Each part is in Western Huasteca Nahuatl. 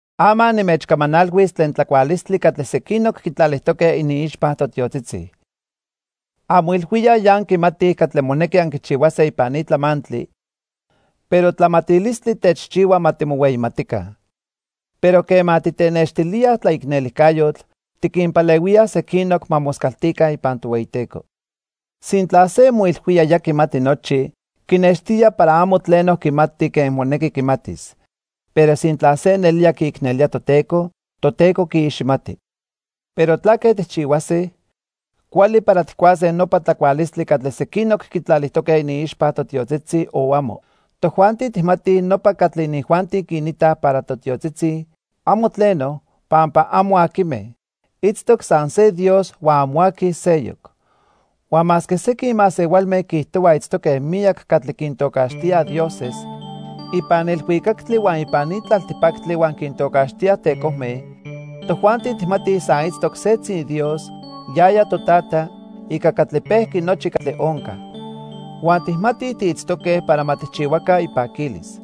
Ama nimechcamanalhuis tlen tlacualistli catli sequinoc quitlalijtoque iniixpa totiotzitzi. Anmoilhuíaj ya anquimatij catli monequi anquichihuase ipan ni tlamantli, pero tlamatilistli techchihua ma timohueyimatica. Pero quema titenextilíaj tlaicnelijcayotl, tiquinpalehuíaj sequinoc ma moscaltica ipan Tohueyiteco. Sintla se moilhuía ya quimati nochi, quinextía para amo tleno quimati quen monequi quimatis. Pero sintla se nelía quiicnelía Toteco, Toteco quiiximati. Pero ¿tlaque tijchihuase? ¿Cuali para tijcuase nopa tlacualistli catli sequinoc quitlalijtoque iniixpa totiotzitzi, o amo? Tojuanti tijmatij nopa catli inijuanti quinitaj para totiotzitzi, amo tleno, pampa amo aquime. Itztoc san se Dios huan amo aqui seyoc. Huan masque sequin masehualme quiijtohuaj itztoque miyac catli quintocaxtía "dioses" ipan ilhuicactli huan ipan ni tlaltipactli huan quintocaxtíaj "tecojme", tojuanti tijmatij san itztoc setzi Dios, yaya Totata, ica catli pejqui nochi catli onca. Huan tijmatij tiitztoque para ma tijchihuaca ipaquilis.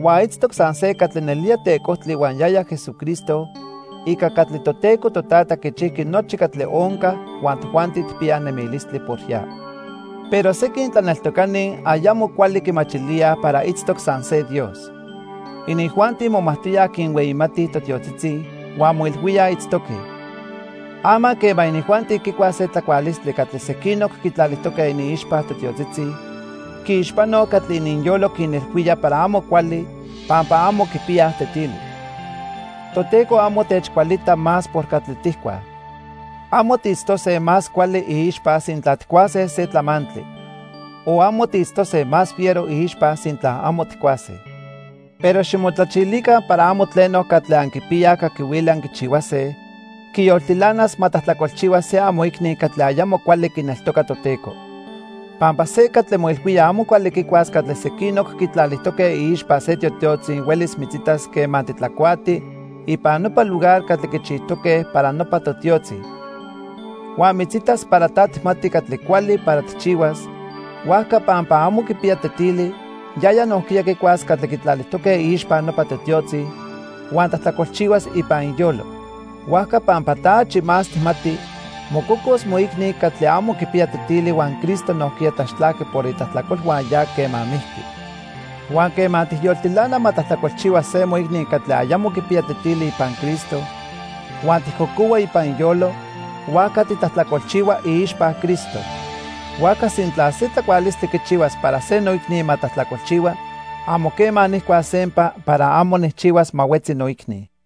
Huan itztoc san se catli nelía tecojtli huan yaya Jesucristo ica catli Toteco Totata quichijqui nochi catli onca huan tojuanti tijpiyaj nemilistli por ya. Pero sequin tlaneltocani ayamo cuali quimachilíaj para itztoc san se Dios. Inijuanti momajtoyaj quinhueyimatij totiotzitzi huan moilhuíaj itztoque. Ama quema inijuanti quicuaj se tlacualistli catli sequinoc quitlalijtoque iniixpa totiotzitzi, quiixpanoj catli ininyolo quinilhuíaj para amo cuali pampa amo quipiyaj tetili. Toteco amo techcualita más por catli tijcuaj. Amo tiitztose más cuali iixpa sintla tijcuase se tlamantli. O amo tiitztose más fiero iixpa sintla amo tijcuase. Pero ximotlachilica para amo tleno catli anquipiyaj caquihuili anquichihuase, quiyoltilanas ma tlajtlacolchihua se amoicni catli ayamo cuali quineltoca Toteco. Pampa se catli moilhuía amo cuali quicuas catli sequinoc quitlalijtoque iixpa se totiotzi huelis mitzitas quema titlacuati ipan nopa lugar catli quichijtoque para nopa totiotzi. Huan mitzitas para ta tijmati catli cuali para tijchihuas, huajca pampa amo quipiya tetili, yaya nojquiya quicuas catli quitlalijtoque iixpa nopa totiotzi, huan tlajtlacolchihuas ipan iyolo. Huajca pampa ta achi más tijmati, mococos moicni catli amo quipiya tetili huan Cristo nojquiya tlaxtlajqui por itlajtlacolhua ya quema mijqui. Huan quema tijyoltilana ma tlajtlacolchihua se moicni catli ayamo quipiya tetili ipan Cristo huan tijcocohua ipan iyolo, huajca titlajtlacolchihua iixpa Cristo. Huajca sintla se tlacualistli quichihuas para se noicni ma tlajtlacolchihua, amo quema nijcuas sempa para amo nijchihuas ma huetzi noicni.